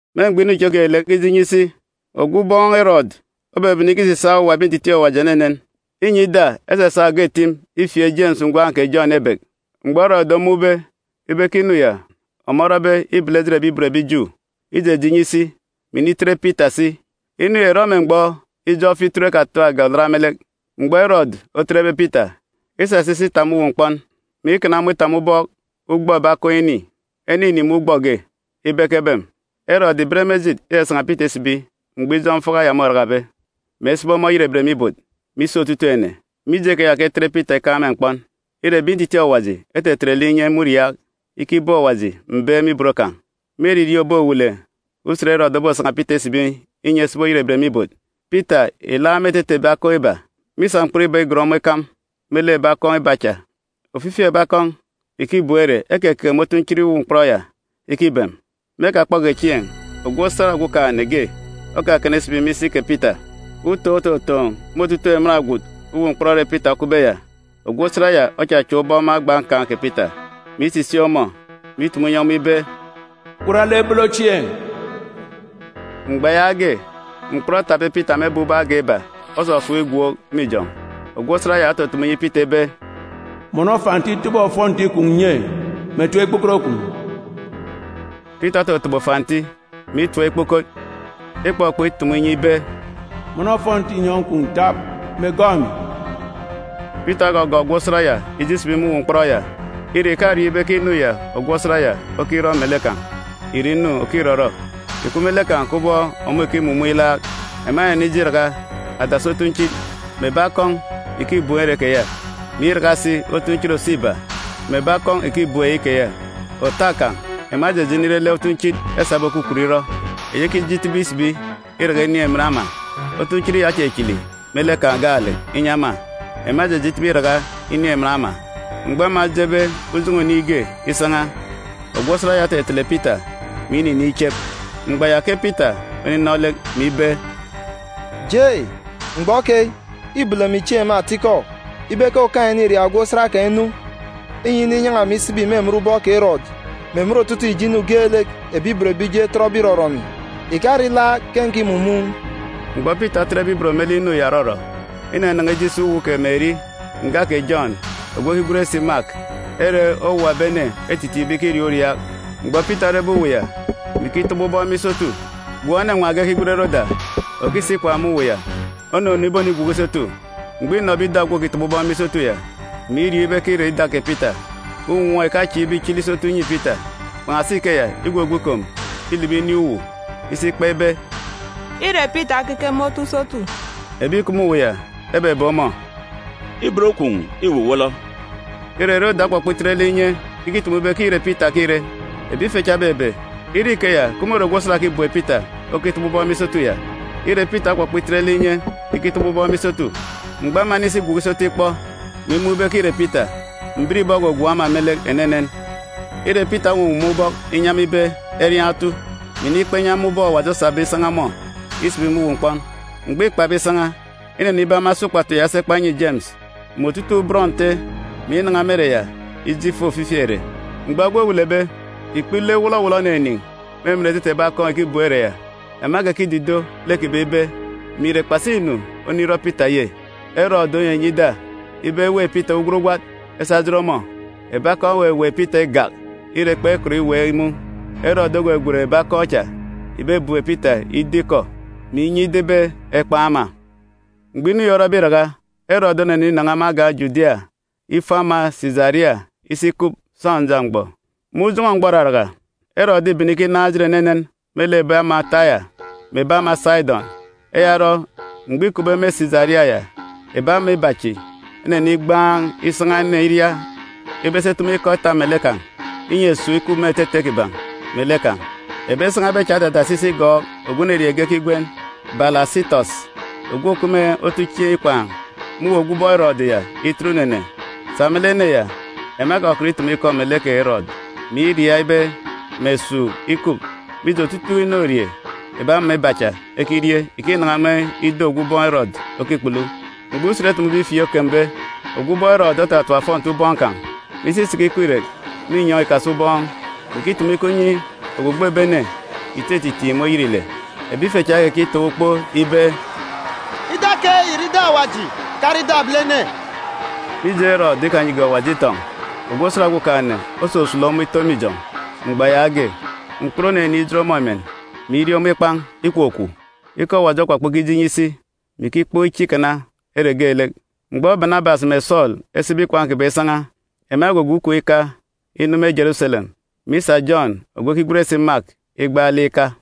Me mgbọ inu chi geelek okije inyi isi, ogwu ubọọn̄ Erọdu obebene ikisisaak owuwa ebi ntitiin̄ Awaji enenen. Înyi ida, esasa oge akọn̄ ifieek Jemis ngwan̄ kè Jọn ebek. Mgbọ Erọdu omun̄be ibe ke inu ya ọmọ orọbe îbele ejit ebi ibot ebi Ju, ijeje inyi isi, mè initet Pita si. Inu ya ìrọ me mgbọ ijọk Fituru Kpunu Olat. Mgbọ Erọdu otetbe Pita, isasa isi itap me uwu mkpọn, mè ikana ọmọ itap me ubọk ugbọ ebi akọn̄ ini, ene ini me ugbọ ge, ibe ekebem. Erọdu ìben me ejit isasan̄a Pita isibi mgbọ ijọk Iraraka môrakabe, mè esibi ọmọ oyerebet me ibot me isi otutuuk ene. Mije keya ke etet Pita ikaan̄ me mkpọn. Ire, ebi ntitiin̄ Awaji etetet lek inye me uriaak, ikibeek Awaji mbeek me ibot kan̄. Me eririeen̄ òbowele usen Erọdu obosan̄a Pita isibi inyi esibi oyerebet me ibot, Pita ìlaak me etete ebi akọn̄ iba. Mîsa mkpọn iba igon ọmọ ikam me lek ebi akọn̄ iba cha, ofifi ebi akọn̄ ìkibem ere ekekeke me otunchit uwu mkpọn ya ikibem. Me ekakpọge chieen̄, ogwu osat Okumugwem ge okakana isibi me isi kè Pita. Utoon̄ ototoon̄ me otutuuk emen agwut uwu mkpọn ere Pita okupbe ya. Ogwu osat ya ochachak ubọk me agba nkan̄ kè Pita, mè isisik ọmọ, mè itumu inyi ọmọ ibe, “Gwat lek bolo chieen̄!” Mgbọ yaage mkpọn etapbe Pita me ebek ubọk agan̄ iba osọsọp igwook me ijọn̄. Ogwu osat ya otutumu inyi Pita ibe, “Mọnọ fanti tobo ofọnti kwun̄ nye, mè tap ikpukot kwun̄!” Pita ototobo fanti, mè itap ikpukot. Ikpọkpọk itumu inyi ibe, “Mọnọ ofọnti inyọn̄ kwun̄ tap, mè gọọk emi!” Pita ogọgọọk ogwu osat ya ije isibi me uwu mkpọn ya. Ire, ìkariọọn̄ ibe ke inu ya ogwu osat ya okirọ melek kan̄ ìre inu òkirọrọ. Ìkup me lek kan̄ kubọk ọmọ ìkimumun̄ ilaak. Ema enenije iraka adasi otunchit mè ebi akọn̄ ìkibem ere keya, mè iraka si otunchit òso iba mè ebi akọn̄ ìkibem eyi keya. Òta kan̄, ema ejeje inire lek otunchit esabe okwukwut irọ, eyi ekije itibi isibi iraka inin̄ emen ama. Otunchit ya ochichili me lek kan̄ gaalek inyi ema. Ema ejeje itibi iraka inin̄ emen ama. Mgbọ ema ejebe ujọn̄ọ oniin̄ ge isan̄a, ogwu osat ya otetele Pita, mè ininiin̄ ichep. Mgbọ ya ke Pita oninọ lek, mè ibe, “Jei, mgbọ keyi, îbolo emi chieen̄ me atikọ ibe ke Okaan̄-ene îria ogwu osat kan̄ inu, inyi ininyan̄a emi isibi me emen ubọk kè Erọdu, mè emen otutuuk ijo inu geelek ebi ibot ebi Ju etọtbe irọrọ emi. Ìkare ilaak ke nkimumun̄.” Mgbọ Pita otetbe ibot me lek inu ya òrọrọ, inanan̄a ije isi uwu kè Meri nga kè Jọn ogwu ekigwen si Mak, ere owuwa ebi ene etitiin̄be ikiriaak uriaak. Mgbọ Pita orebe uwu ya, mè ikitọbọ ubọk me isotu, gwun̄ enenwaan̄ ge ekigwen Roda, òkisi ikwaan̄ me uwu ya onunu ibonigwuku isotu. Mgbọ înọbe ida ogwu òkitọbọ ubọk me isotu ya, mè iriọọn̄ ibe ke îre ida kè Pita, unwọọn̄ ìkachieek ibe ichili isotu inyi Pita. Kpan̄asi ikeya, igwugwu ikom ilibi inin̄ uwu isi ikpa ibe, “Îre Pita okeke me otu isotu!” Ebi ìkup me uwu ya ebebe ọmọ, “Ibot kwun̄ îwuwọlọ!” Ire, Roda okpọkpọ itet otu inye ikitumu ibe ke îre Pita ke îre. Ebi ife cha ebebe, ire ikeya, ke môre ogwu osat òkibem Pita okitọbọ ubọk me isotu ya. Ire, Pita okpọkpọ itet lek inye ikitọbọ ubọk me isotu. Mgbọ ema enisi igwuku isotu ikpọ, mè imun̄ ibe ke îre Pita, mbiribọ ogwogwook ema me lek enenen. Ire, Pita owuwuwum ubọk inyi ema ibe eriaan̄ otu, mè inikpa inyi ema ubọk Awaji osabe isan̄a ọmọ isibi me uwu mkpọn. Mgbọ îkpabe isan̄a, inenibe ema esa ukpatu ya esi ekpa enyi Jemis mè otutuuk bọn Nte, mè inan̄a me ere ya ije ifo ofifi ere. Mgbọ egwe owelebe, ikpele wọlọwọlọ oninin̄ me etete ebi akọn̄ ìkibem ere ya. Ema ekekidido lek kiban̄ ibe mè ìre kpasi inu onirọ Pita ye? Erọdu onyinyi ida ibe eweek Pita ugwat ugwat esa ejet ọmọ. Ebi akọn̄ eweweek Pita igak, ire, kpekọt iweek imun̄. Erọdu ogwegwen ebi akọn̄ cha ìbebem Pita ido ikọ, mè inyi ida ibe ekpan̄ ema. Mkpa kè Erọdu Mgbọ inu yi orọbe iraka, Erọdu oneninan̄a me agan̄ Judia ifo ama Sisaria isi ikup sọnja mgbọ. Me ujọn̄ọ mgbọ òraraka, Erọdu îbene ikinaan̄ ejit enenen me lek ebi ama Taya mè ebi ama Sidọn. Eya orọ, mgbọ îkupbe me Sisaria ya, ebi ama iba chi enenigbaan̄ isan̄a ene iria ibe esi etumu ikọ eta melek kan̄, inyi esuuk ikup me etete kiban̄ melek kan̄. Ebi esan̄abe cha edadasi isi igọọk ogwu enerieen̄ ge ekigwen Balasitọs, ogwu òkup me otuchieen̄ ikwaan̄ me uwu ogwu ubọọn̄ Erọdu ya itet unene. Sa me lek ene ya, ema ekọkọt itumu ikọ melek kè Erọdu, mè iriaak ibe mè esuuk ikup, mije, otutuuk inorie ebi ama iba cha ekirie ìkinan̄a me ido ogwu ubọọn̄ Erọdu okikpulu. Mgbọ usen etumube ifieek okembe, ogwu ubọọn̄ Erọdu otatap ofọnti ubọọn̄ kan̄, mè isi isiki ikweek irek me inyọn̄ ogboon̄ ubọọn̄, mè ikitumu ikọ inyi ogbogbo ebi ene ìtititiin̄ me oyet ile. Ebi ife cha ekekitaan̄ ukpo ibe, “Ida keyi ìre ida awaji, ìkare ida ebilene!” Mije Erọdu ikanyige Awaji itọn̄, ogwu osat Okumugwem osusulu ọmọ ito me ijọn̄ mgbọ yaage. Mkput oninin̄ ijot ọmọ emen, mè irie ọmọ ikpan̄. Ikwukwu. Ikọ Awaji okpọkpọ ikije inyi isi, mè ikikpọk iche ikana ere geelek. Mgbọ Banabas mè Sọọlu esibe ikwaan̄ kiban̄ isan̄a, ema egwugwu ikom ika inu Jeruselem, mè isa Jọn ogwu ekigwen si Mak igbaalek ika.